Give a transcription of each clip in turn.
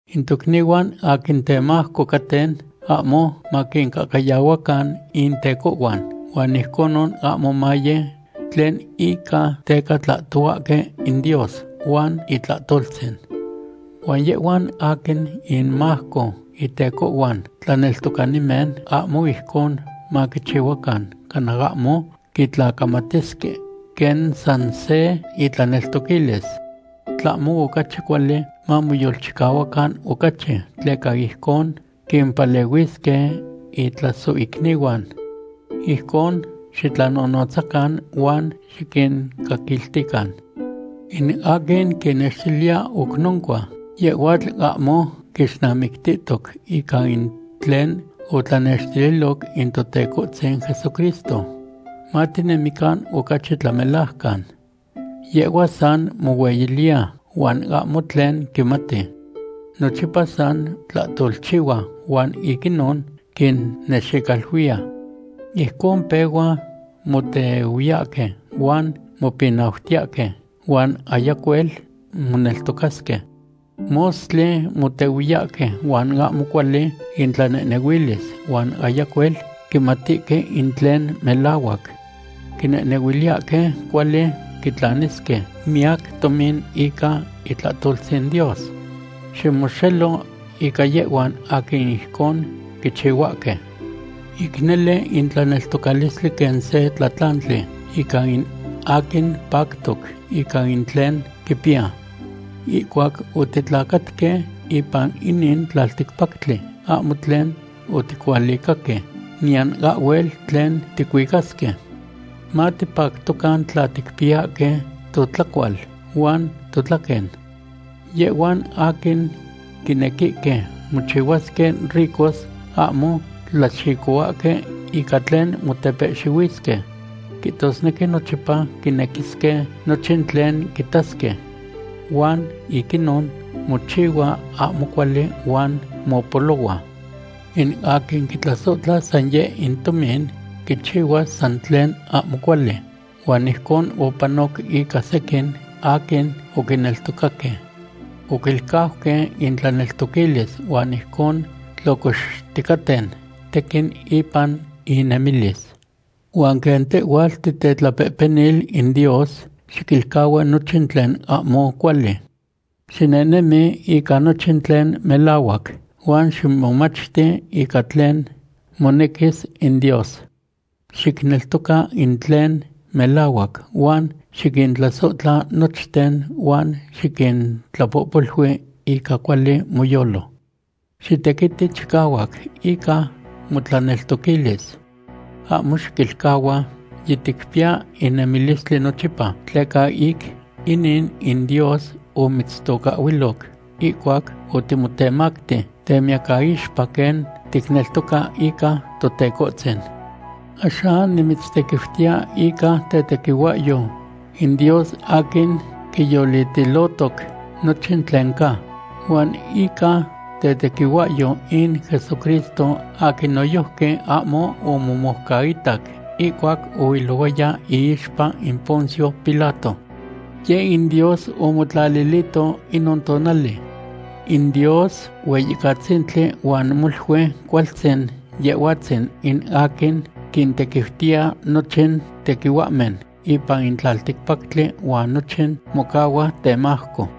In tocnihuan aquin temajco caten ahmo maquincahcayahuacan intecohhuan huan ijconon ahmo maye tlen ica teca tlahtohuahque in Dios huan itlahtoltzin. Huan yehhuan aquin inmajco intecohhuan tlaneltocanimen ahmo ijcon maquichihuacan cana ahmo quitlacamatisque quen san se intlaneltoquilis. Tlahmo ocachi cuali mamoyolchicahuacan ocachi, tleca ijcon quimpalehuisque intlasohicnihuan. Ijcon xitlanonotzacan huan xiquincaquiltican. In aquin quinextiliya oc noncua, yehhuatl ahmo quixnamictihtoc ica in tlen otlanextililoc in Totecohtzin Jesucristo, matinemican ocachi tlamelajcan. Yehhua san mohueyiliya huan ahmo tlen quimati. Nochipa san tlahtolchihua huan ic inon quinnexicaluiya. Ijcon pehua motehuiyahque huan mopinautiyahque huan ayacuel moneltocasque. Mostli motehuiyahque huan ahmo cuali intlanehnehuilis huan ayacuel quimatihque in tlen melahuac. Quinehnehuiliyahque cuali quitlanisque miyac tomin ica itlahtoltzin Dios. Ximoxelo ica yehhuan aquin ijcon quichihuahque. Ic nele in tlaneltocalistli quen se tlatlantli ica in aquin pactoc ica in tlen quipiya. Ihcuac otitlacatque ipan inin tlalticpactli ahmo tlen oticualicaque, niyan ahhuel tlen ticuicasque. Matipactocan tla ticpiyahque totlacual huan totlaquen. Yehhuan aquin quinequihque mochihuasque ricos ahmo tlaxicohuahque ica tlen motepehxihuisque, quihtosnequi nochipa quinequisque nochin tlen quitasque. Huan ic inon mochihua ahmo cuali huan mopolohua. In aquin quitlasohtla san yeh in tomin quichihuas san tlen ahmo cuali. Huan ijcon opanoc ica sequin aquin oquineltocaque. Oquilcauque intlaneltoquilis huan ijcon tlocoxticaten tequin ipan innemilis. Huan quen tehhuatl titetlapehpenil in Dios, xiquilcahua nochin tlen ahmo cuali. Xinehnemi ica nochin tlen melahuac, huan ximomachti ica tlen monequis in Dios. Xicneltoca in tlen melahuac huan xiquintlasohtla nochten huan xiquintlapohpolui ica cuali moyolo. Xitequiti chicahuac ica motlaneltoquilis. Ahmo xiquilcahua yiticpiya in nemilistli nochipa, tleca ic inin in Dios omitztocahhuiloc ihcuac otimotemacti temiyacaixpa quen ticneltoca ica Totecohtzin. Axan nimitztequiutiya ica tetequihuahyo in Dios aquin quiyolitilohtoc nochin tlen ca, huan ica tetequihuahyo in Jesucristo aquin noyojqui ahmo omomoucaitac ihcuac oilohuaya iixpa in Poncio Pilato. Yeh in Dios omotlalilihtoc inon tonali. In Dios Hueyicatzintli huan molui cualtzin Yehhuatzin in aquin quintequiutiya nochin tequihuahmen ipan in tlalticpactli huan nochin mocahua temajco.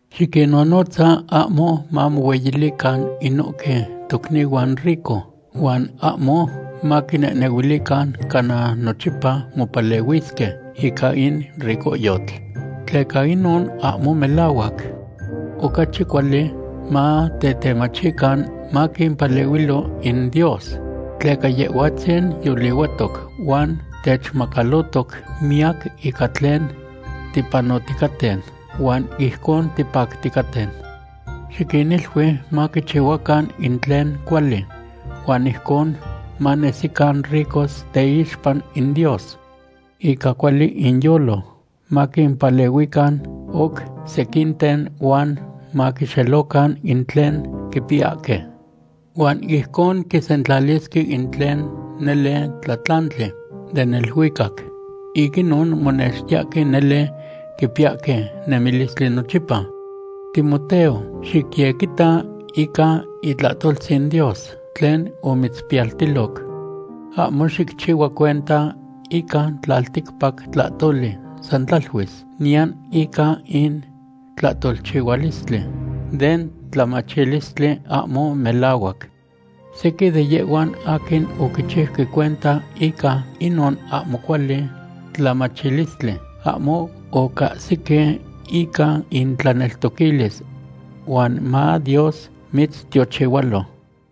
Xiquinnonotza ahmo mamohueyilican inohque tocnihuan rico huan ahmo maquinehnehuilican cana nochipa mopalehuisque ica in ricohyotl, tleca inon ahmo melahuac. Ocachi cuali matetemachican maquimpalehuilo in Dios, tleca Yehhuatzin yolihuatoc huan techmacalotoc miyac ica tlen tipanoticaten, huan ijcon tipacticaten. Xiquinilui maquichihuacan in tlen cuali huan ijcon manesican ricos teixpa in Dios. Ica cuali inyolo maquimpalehuican oc sequinten huan maquixelocan in tlen quipiyahque. Huan ijcon quisentlalisque in tlen nele tlatlantli den neluicac. Ic inon monextiyahque nele quipiyahque nemilistli nochipa. Timoteo, xicyequita ica itlahtoltzin Dios tlen omitzpiyaltiloc. Ahmo xicchihua cuenta ica tlalticpac tlahtoli san tlaluis, niyan ica in tlahtolchihualistli den tlamachilistli ahmo melahuac. Sequin de yehhuan aquin oquichiuque cuenta ica inon ahmo cuali tlamachilistli ahmo ocahsique ica intlaneltoquilis. Huan ma Dios mitztiochihualo.